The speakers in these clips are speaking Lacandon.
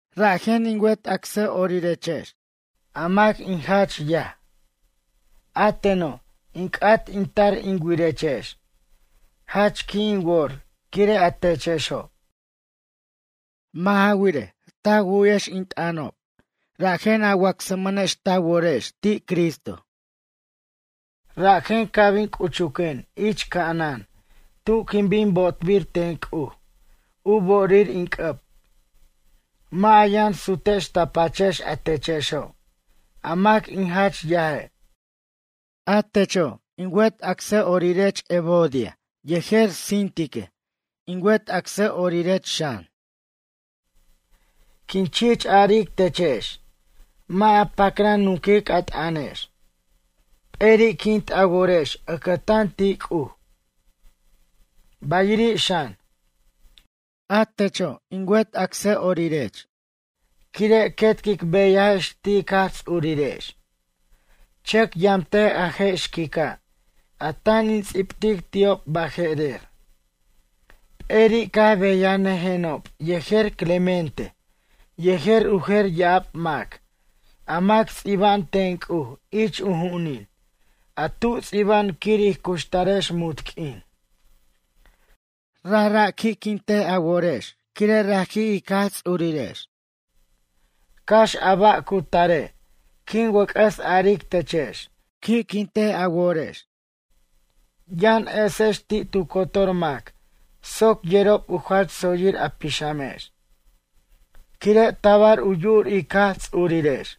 Rajen in wet acsʌ'orirex, a mac in jach yaj. A teno', in c'at in tar in wirechex. Jach qui' in wor quire' a techexo'. Mʌ' ja wirej, ta wu'yex in t'ʌnob rajen a wacsmʌnex ta worex ti' Cristo. Rajen ca' bin c'uchuquen ich ca'anan tu quin bin bo'tbir ten C'uj u bo'orir in c'ʌb. Mʌ' a yʌn sutex ta pachex a techexo' a mac in jach yaje'. A techo' in wet acsʌ'orirech Evodia yejer Síntique, in wet acsʌ'orirech xan. Quin chich aric techex, mʌ' a pacran nunquic a t'ʌnex. P'eri'quint a worex ʌcʌtan ti' C'uj. Bayiri' xan, a techo' in wet acsʌ'orirech quire' quet quic beyajex ti' ic Jaj Ts'urirex, chʌc yamtej a je' xquica' a tan in ts'ibtic ti'ob baje'rer, p'eri' caj beyanʌjenob yejer Clemente yejer u jer ya'ab mac, a mac ts'iba'an ten C'uj ich u ju'unin a tu ts'iba'an quir ij cuxtarex munt q'uin. Rajra' qui'quint a worex quire' raji' ic Jaj Ts'urirex. Cax a ba' cu tare' quin wʌc'ʌs aric techex, qui'quint a worex. Yʌn esex ti' tu cotor mac soc yerob u jach tsoyir a pixamex, quire' tabar u yu'ur ic Jaj Ts'urirex.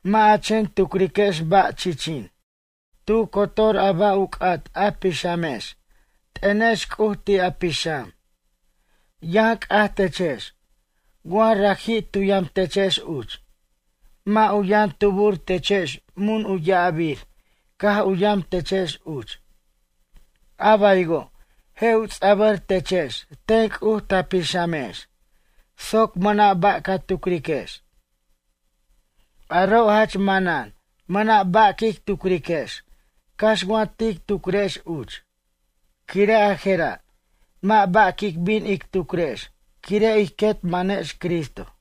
Mʌ' a chen tucriquex ba', chichin. Tu cotor a ba' u c'at a pixamex t'ʌnex C'uj ti' a pixam. Yʌn c'aj techex, wa raji' tu yamtechex uch. Mʌ' u yʌn tubur techex mun u ya'abir caj u yam techex uch. A baywo' je' u ts'a'bʌr techex ten C'uj ta pixamex soc mʌna' ba' ca tucriquex. Aro' jach manan mʌna' ba' quic tucriquex cax wa tic tucrex uch. Quire' a je'ra' mʌ' ba' quic bin ic tucrex quire' ij quet manex Cristo.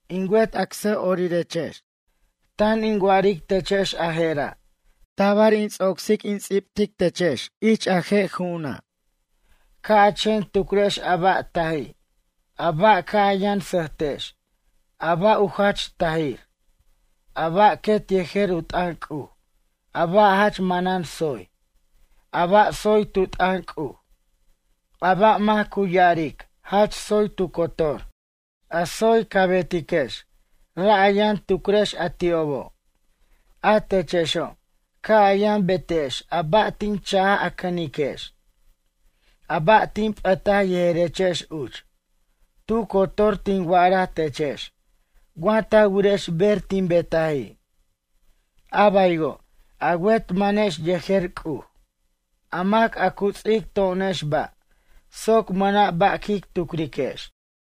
In wet acsʌ'orirex, tan in wa'aric techex a je'ra', tabar in ts'ocsic in ts'ibtic techex ich a je' ju'una'. Ca' a chen tucrex a ba' taji', a ba' ca' a yʌn sʌjtex, a ba' u jach tajir, a ba' quet yejer u t'ʌn C'uj, a ba' jach manan tsoy, a ba' tsoy tu t'ʌn C'uj, a ba' mac cu ya'aric jach tsoy tu cotor, a tsoy ca betiquex ra' a yʌn tucrex a ti'obo'. A techexo', ca' a yʌn betex a ba' tin chaj a cʌniquex, a ba' tin p'ʌtaj yejerechex uch, tu cotor tin wa'araj techex wa ta wirex ber tin betaji'. A baywo' a wet manex yejer C'uj, a mac a cu ts'ic to'onex ba' soc mʌna' ba' quic tucriquex.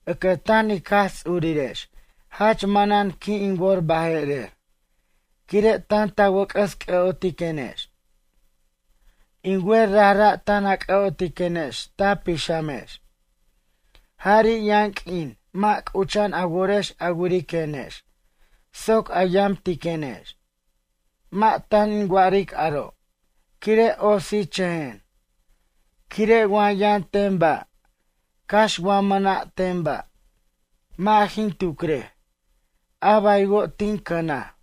Ʌcʌtan ic Jaj Ts'urirex jach manan qui' in wor baje'rer quire' tan ta wʌc'ʌs c'ʌ'otiquenex. In wer rajra' tan a c'ʌ'otiquenex ta pixamex. Jari' yʌn q'uin mʌ' c'ucha'an a worex a wiriquenex soc a yamtiquenex. Mʌ' tan in wa'aric aro' quire' otsichʌjen. Quire' wa yʌn ten ba', cax wa mʌna' ten ba', mʌ' jin tucrej, a baywo' tin cʌnaj.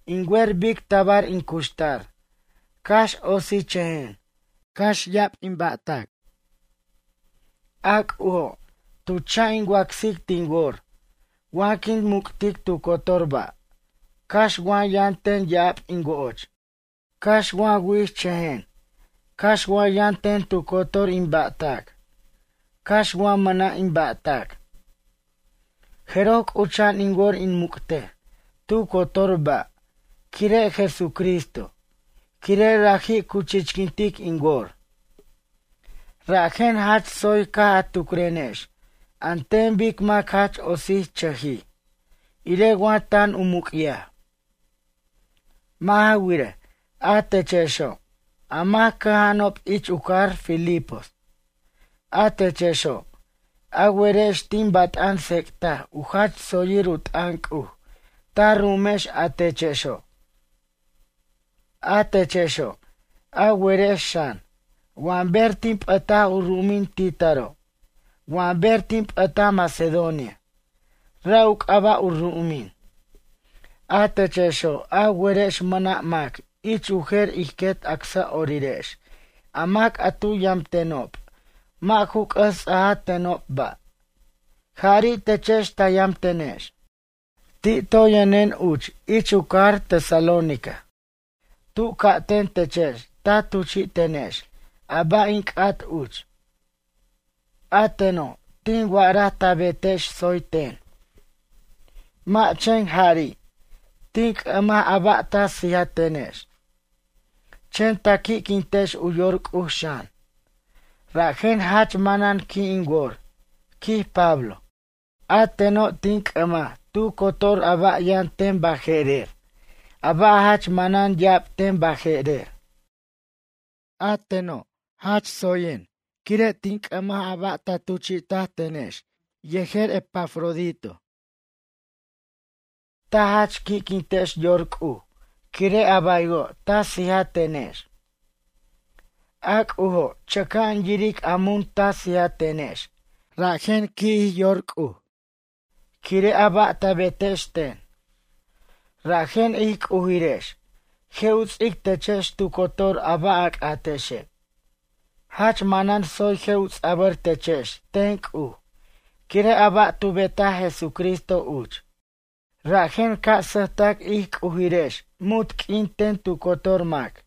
In wer bic tabar in cuxtar cax otsichʌjen cax ricochʌjen. A C'ujo' tu cha' in wacsic tin wor wa quin muc'tic tu cotor ba', cax wa yʌn ten ya'ab in wo'och, cax wa wi'chʌjen, cax wa yʌn ten tu cotor in ba'tac, cax wa mʌna' in ba'tac. Jeroj c'ucha'an in wor in muc'tej tu cotor ba' quire' Jesucristo quire' raji' cu chichquintic in wor. Rajen jach tsoy caj a tucrenex an ten bic mac jach otsichʌjij, irej wa tan u muc'yaj. Mʌ' ja wirej, a techexo', a mac cʌja'anob ich u cajar Filipos. A techexo', a werex tin bat'an tsec'taj u jach tsoyir u t'ʌn C'uj ta ru'umex a techexo'. A techexo', a werex xan, wa ber tin p'ʌtaj u ru'umin ti' taro', wa ber tin p'ʌtaj Macedonia ra' u c'aba' u ru'umin. A techexo', a werex mʌna' mac ich u jer ij quet acsʌ'orirex a mac a tu yamtenob mʌ' ju c'ʌs ts'aja tenob ba', jari' techex ta yamtenex. Ti' toy yʌnen uch ich u cajar Tesalónica tu ca'ten techex ta tuchi'tenex a ba' in c'at uch. A teno' tin wa'araj ta betex tsoy ten. Mʌ' chen jari' tin c'ʌmaj a ba' ta sijatenex, chen ta qui'quintex u yor C'uj xan, rajen jach manan qui' in wor, quij Pablo. A teno' tin c'ʌmaj tu cotor a ba' yʌn ten baje'rer, a ba' jach manan ya'ab ten baje'rer. A teno' jach tsoyen quire' tin c'ʌmaj a ba' ta tuchi'tenex yejer Epafrodito. Ta jach qui'quintex yor C'uj quire' a baywo' ta sijatenex. A C'ujo' chʌca'an yiric a mun ta sijatenex, rajen qui'jij yor C'uj, quire' a ba' ta betex ten. Rajen ij C'ujirex je' u ts'ic techex tu cotor a ba' a c'atexe'. Jach manan tsoy je' u ts'abʌr techex ten C'uj quire' a ba' tu betaj Jesucristo uch. Rajen ca' sʌjtac ij C'ujirex munt q'uin ten tu cotor mac.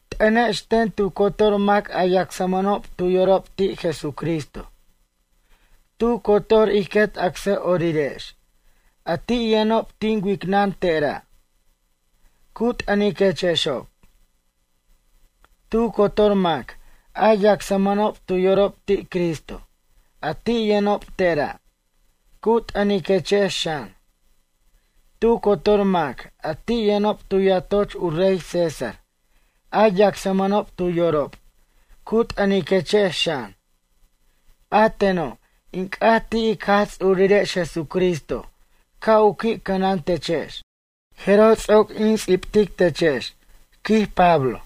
T'ʌnex ten tu cotor mac a yacsmʌnob tu yorob ti' Jesucristo. Tu cotor ij quet acsʌ'orirex a ti' yʌnob tin wicnʌn tera', cu t'ʌniquechexob. Tu cotor mac a yacsmʌnob tu yorob ti' Cristo a ti' yʌnob tera', cu t'ʌniquechex xan. Tu cotor mac a ti' yʌnob tu yatoch u rey César, a yacsmʌnob tu yorob, cu t'ʌniquechex xan. A teno' in c'at ti' ic Jaj Ts'urirex Jesucristo ca' u qui' cʌnantechex. Jeroj ts'oc in ts'ibtic techex, quij Pablo.